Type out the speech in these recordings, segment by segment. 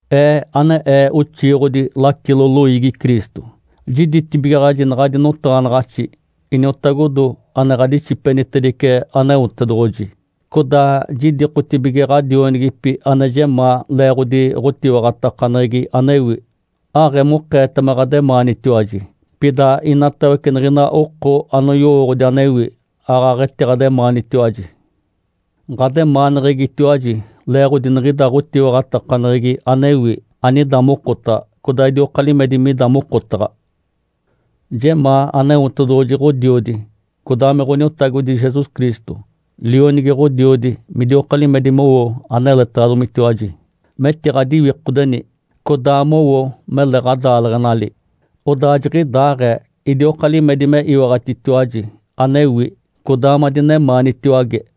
Ee ane ee oxiiɡ̶odi lacilo loiigi Cristo, jiditibigaɡ̶aji naɡ̶adi notaɡ̶anaɡ̶axi, iniotagodo ane ɡ̶adixipenitedice Aneotedoɡ̶oji. Codaa jidikotibige ɡ̶adionigipi ane jemaa leeɡ̶odi ɡ̶otiwaɡ̶atakaneɡ̶egi anewi. Aɡ̶emokeeta me ɡ̶ademaanitiwaji, pida inatawece niɡ̶ina oko anoyowooɡ̶odi anewi, aaɡ̶aɡ̶etiɡ̶ademaanitiwaji. Ǥademaaneɡ̶egitiwaji leeɡ̶odi niɡ̶ida ɡ̶otiwaɡ̶atakaneɡ̶egi anewi, anida mokotaɡ̶a, codaa idioka limedi mida mokotaɡ̶a. Jemaa Aneotedoɡ̶oji Ǥodiodi, codaa me Ǥoniotagodi Jesus Cristo, Lionigi Ǥodiodi, midioka limedi mowo aneletaɡ̶adomitiwaji, metiɡ̶adiwikodeni, codaa mowo mele ɡ̶adaaleɡ̶enali. Odaa jiɡ̶idaaɡ̶ee idioka limedi me iwaɡ̶atitiwaji anewi, codaa madinemaanitiwage.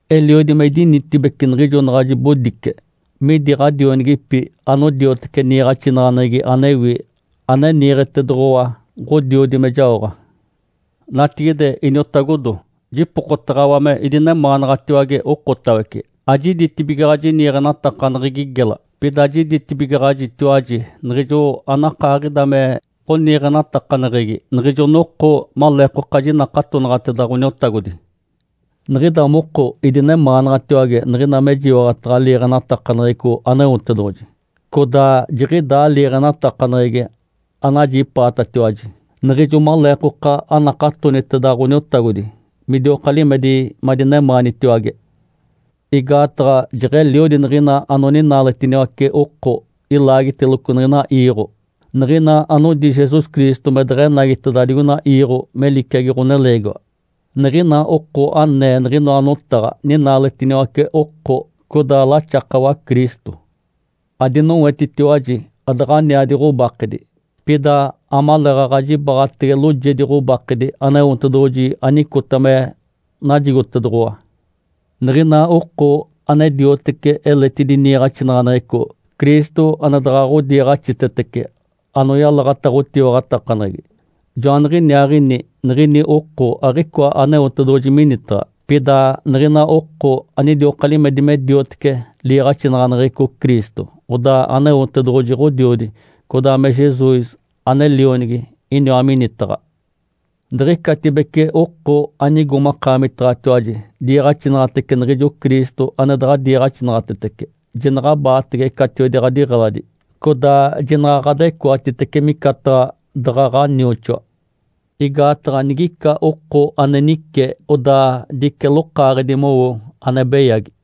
Eliodi me idinitibece niɡ̶ijo naɡ̶a jibodice midi ɡ̶adionigipi anodiotece niiɡ̶axinaɡ̶aneɡ̶egi anewi, ane niiɡ̶etedoɡ̶owa Ǥodiodi me jaoɡ̶a. Natigide iniotagodo, jipokotaɡ̶awa me idinemaanaɡ̶atiwage okotawece. Ajiditibigaɡ̶aji niiɡ̶enatakaneɡ̶egi gela, pida jiditibigaɡ̶ajitiwaji niɡ̶ijo anakaaɡ̶ida me ɡ̶oniiɡ̶enatakaneɡ̶egi niɡ̶ijo noko maleekoka jinakatonaɡ̶ateda Ǥoniotagodi. Niɡ̶ida moko idinemaanaɡ̶atiwage niɡ̶ina mejiwaɡ̶ataɡ̶a liiɡ̶enatakaneɡ̶eco Aneotedoɡ̶oji, codaa jiɡ̶idaa liiɡ̶enatakaneɡ̶egi anajipaatatiwaji niɡ̶ijo maleekoka anakatoniteda Ǥoniotagodi, midioka limedi madinemaanitiwage. Igaataɡ̶a jeɡ̶eliodi niɡ̶ina anoninaaletiniwace oko ilaagiteloco niɡ̶ina iiɡ̶o, niɡ̶ina anodi Jesus Cristo me deɡ̶enagiteda digoina iiɡ̶o me liciagi ɡ̶oneleegiwa. Niɡ̶ina oko anee niɡ̶inoa notaɡ̶a ninaaletiniwace oko, codaa laxakawa Cristo. Adinowetitiwaji adaɡ̶aniadi ɡ̶obakedi, pida amaleeɡ̶aɡ̶a jibaɡ̶atege loojedi ɡ̶obakedi Aneotedoɡ̶oji anicota me najigotedoɡ̶owa. Niɡ̶ina oko ane dioteci eletidi niiɡ̶axinaɡ̶aneɡ̶eco, Cristo ane daɡ̶a ɡ̶odiiɡ̶axitetece anoyalaɡ̶ata ɡ̶otiwaɡ̶atakaneɡ̶egi, joaniɡ̶iniaaɡ̶ini niɡ̶ini oko aɡ̶icoa Aneotedoɡ̶oji minitaɡ̶a. Pida niɡ̶ina oko anidioka limedi me diotece liiɡ̶axinaɡ̶aneɡ̶eco Cristo, odaa Aneotedoɡ̶oji Ǥodiodi, codaa me Jesus ane Lionigi, iniwa minitaɡ̶a. Diɡ̶icatibece oko anigo makaamitaɡ̶atiwaji diiɡ̶axinaɡ̶atece niɡ̶ijo Cristo ane daɡ̶a diiɡ̶axinaɡ̶atetece, jinaɡ̶abaatege catiwedi ɡ̶adiɡ̶eladi, codaa jinaɡ̶a ɡ̶adecoatitece micataɡ̶a daɡ̶a ɡ̶anioxoa. Igaataɡ̶a nigica oko ane nice, odaa dice lokaaɡ̶edi mowo ane beyagi.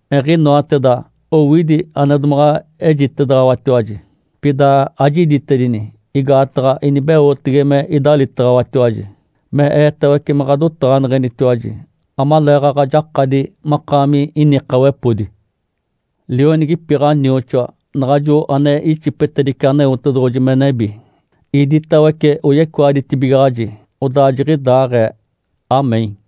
Eɡ̶inoateda owidi ane domaɡ̶a ejitedaɡ̶awatiwaji, pida ajiditedini, igaataɡ̶a inibeotege me idalitaɡ̶awatiwaji, me eetawece me ɡ̶adotaɡ̶aneɡ̶enitiwaji, amaleeɡ̶aɡ̶a jakadi makaami inikawepodi. Lionigipi ɡ̶anioxoa, naɡ̶ajo ane ixipetedice Aneotedoɡ̶oji me nebi, iditawece oyecoaditibigaɡ̶aji. Odaa jiɡ̶idaaɡ̶ee. (Amém).